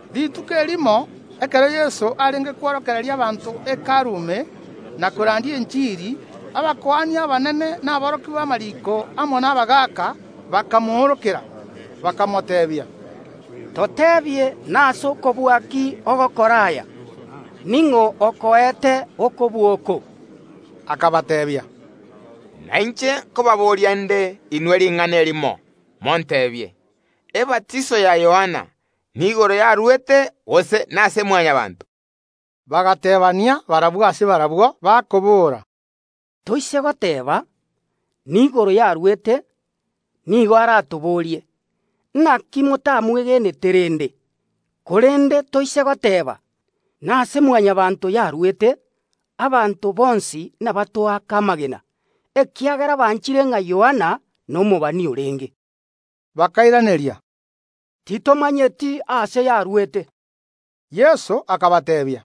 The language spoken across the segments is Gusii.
Rituko erimo ekero Yeso arenge kworokereria abanto Hekalu ime, na korandia enchiri, abakuani abanene na aborokia b’amariiko amo nabagaaka bakamoorokera, bakamoteebia, “Toteebie nase okobua ki ogokora aya? Ning’o okoete okobua oko?” Akabateebia, “Nainche nkobaboria nde inwe ring’ana erimo, monteebie: Ebatiso ya Yohana, niigoro yarwete, gose nase Mwanyabaanto?” Bagateebania barabwo ase barabwo, bakobora, “Toise goteeba: Niigoro yarwete, nigo aratoborie: Naki motamwegenete rende? Korende toise goteeba: Nase Mwanyabaanto yarwete, abanto bonsi nabatoake amagena; ekiagera banchire ng’a Yohana nomobani orenge.” Bakairaneria, “Titomanyeti aase yarwete.” Yeso akabateebia,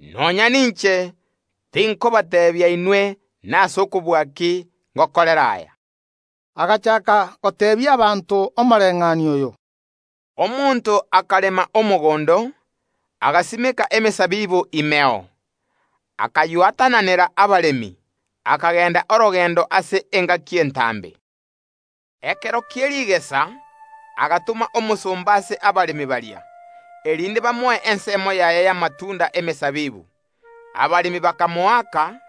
“Nonya ninche tinkobateebia inwe nase okobua ki ngokorera aya.” Agachaaka goteebia abanto omoreng’anio oyo: “Omonto akarema omogondo, agasimeka emesabibu imeo, akaywatananera abaremi, akagenda orogendo ase engaki entambe. Ekero kie rigesa agatoma omosomba ase abaremi baria, erinde bamoe ensemo yaye y’amatunda y’emesabibu. Abaremi bakamoaka,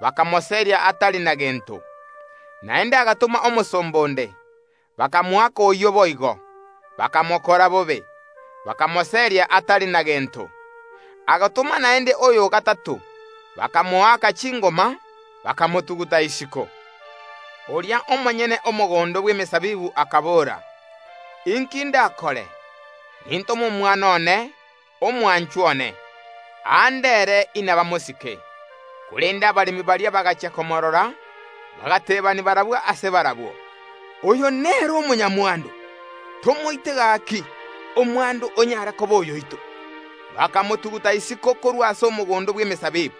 bakamoseria atari na gento. Naende agatoma omosomba onde; bakamoaka oyio boigo, bakamokora bobe, bakamoseria atari na gento. Agatoma naende oyo o gatato, bakamoaka chingoma, bakamotuguta isiko. Oria omonyene omogondo bw’emesabibu akabora: Inki ndakore? Nintome omwana one, omwanchwa one, aande ere inabamosike. Korende abaremi baria bagachia komoorora, bagateebania barabwo ase barabwo: Oyo nere omonyamwando, tomoite gaki, omwando onyare koba oyoito. Bakamotuguta isiko korwa ase omogondo bw’emesabibu,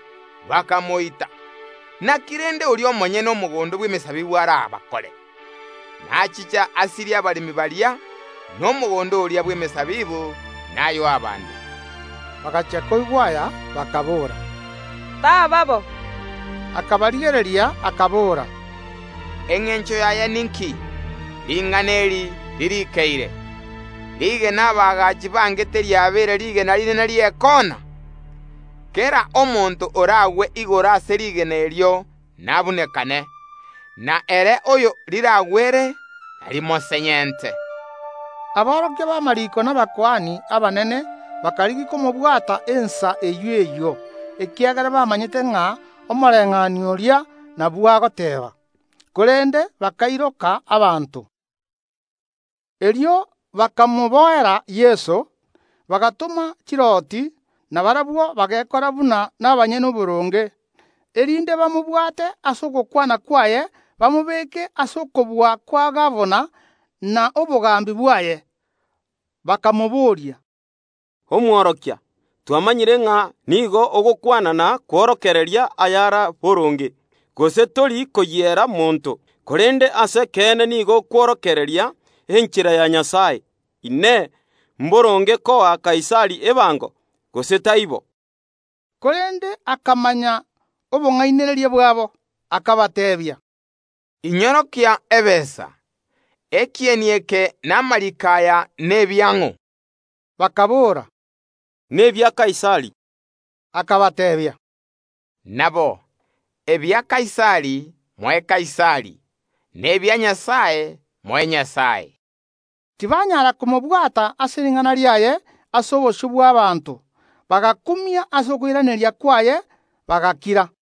bakamoita. Naki rende oria omonyene omogondo bw’emesabibu arabakore? Nachiche asirie abaremi baria, na omogondo oria bw’emesabibu nayoe abande.” Bagachia koigwa aya, bakaboora, “Taba bo.” Akabarigereria, akabora, Engencho yaye ninki, ring’ana eri ririikeire: Rigena abaagachi bangete riabeire rigena rinene ri’ekoona? Kera omonto oragwe igoro ase rigena erio nabunanekane, na ere oyo riragwere narimosenyente. Aborokia b’amariiko na abakuani abanene bakarigia komobwata ensa eyio eyio, ekiagera bamanyete ng’a omoreng’anio oria nabwo akobayeena, korende bakairoka abanto. Erio bakamoboera Yeso, bagatoma chirooti, na barabwo bagekora buna nabanyene oboronge, erinde bamobwate ase ogokwana kwaye, bamobeke ase okobua kwa gabana na obogambi bwaye. Bakamobooria, “Omworokia, twamanyire ng’a nigo ogokwana na kworokereria ayare boronge, gose tori koyiera monto, korende ase ekeene nigo okworokereria enchera ya Nyasae. Inee! Mboronge koa Kaisari ebango, gose taibo?” Korende akamanya obong’ainereria bwabo, akabateebia, “Inyorokie ebesa! Ekieni eke na amariiko aya nebiang’o?” Bakaboora, “Nebia Kaisari.” Akabateebia, “Nabo, ebia Kaisari moe Kaisari, na ebia Nyasae moe Nyasae.” Tibanyaara komobwata ase ring’ana riaye ase obosio bw’abaanto; bagakumia ase okoiraneria kwaye, bagakira.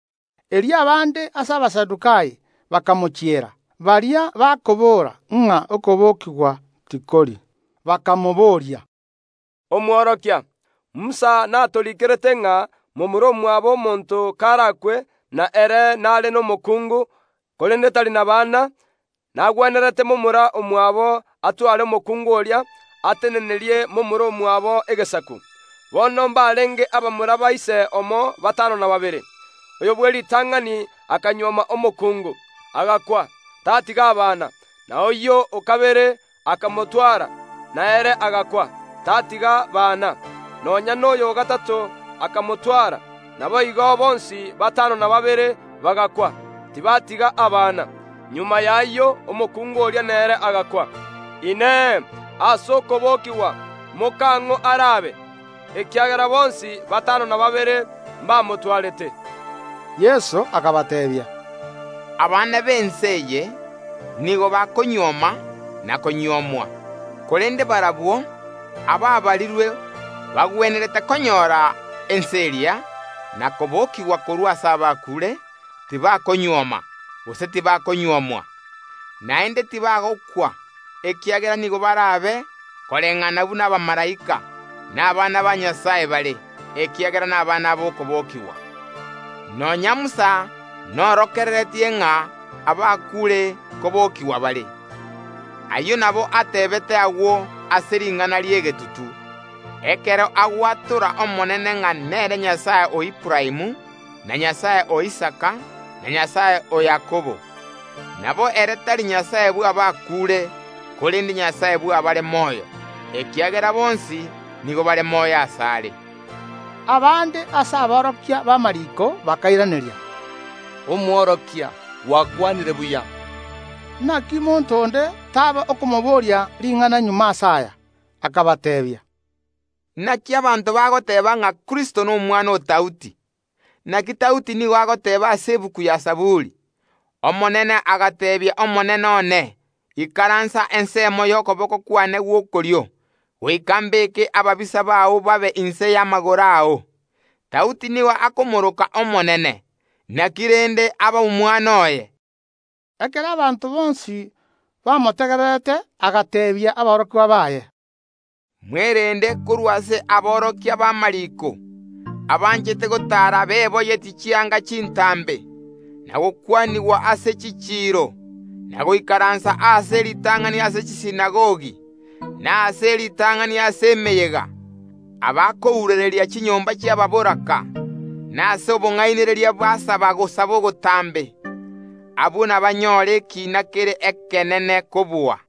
Erio abande ase Abasadukai bakamochiera, baria bakoboora ng’a okobokigwa tikori, bakamobooria, “Omworokia, Musa natoriikerete ng’a momura omwabo omonto karakwe, na ere nare nomokuungu, korende tari nabana, nagwenerete momura omwabo atware omokungu oria, atenenerie momura omwabo egesaku. Bono mbarenge abamura ba ise omo batano na babere. Oyo bw’eritang’ani akanyuoma omokungu, agakwa, tatiga abana; na oyio o kabere akamotwara, na ere agakwa, tatiga bana; nonya noyo o gatato akamotwara. Naboigo bonsi batano na babere bagakwa, tibatiga abana. Magega y’ayio omokungu oria nere agakwa. Inee! Ase okobokigwa mokang’o arabe? Ekiagera bonsi batano na babere mbamotwarete.” Yeso akabateebia, “Abana b’ense eye nigo bakonyuoma na konyuomwa; korende barabwo abaabarirwe bagwenerete konyora ense eria, na kobokigwa korwa ase abakuure, tibakonyuoma, gose tibakonyuomwa. Naende tibagokwa, ekiagera nigo barabe koreng’ana buna abamalaika, na abana ba Nyasae bare, ekiagera nabana b’okobokigwa. Nonya Musa naorokereretie ng’a abakuure nkobokigwa bare. Ayio nabo ateebete agwo ase ring’ana ri’egetutu, ekero agwatora Omonene ng’a nere Nyasae o Aburaamu, na Nyasae o Isaka, na Nyasae o Yakobo. Nabo ere tari Nyasae bw’abakuure, korende Nyasae bw’abare moyo, ekiagera bonsi nigo bare moyo asare.” Abande ase aborokia b’amariiko bakairaneria, “Omworokia, gwakwanire buya.” Naki monto onde taaba okomoboria ring’ana magega ase aya. Akabateebia, Naki abanto bagoteeba ng’a Kristo nomwana o Daudi? Naki Daudi nigo agoteeba ase Egetabu gia Zaburi, Omonene agateebia Omonene one, Ikaransa ensemo y’okoboko kwane gw’okorio, goika mbeeke ababisa bao babe inse y’amagoro ao. Daudi nigo akomoroka Omonene, naki rende aba omwana oye? Ekero abanto bonsi bamotegererete agateebia aborokigwa baye, “Mwerende korwa ase aborokia b’amariiko, abanchete gotaara beboyetie chianga chintambe, na gokwanigwa ase chichiiro, na goikaransa aase e ritang’ani ase chisinagogi, na aase e ritang’ani ase emeyega, abakourereria chinyomba chiababoraka, na ase obong’ainereria basaba ogosaba ogotambe. Abwo nabanyore ekiina kere ekenene kobua.”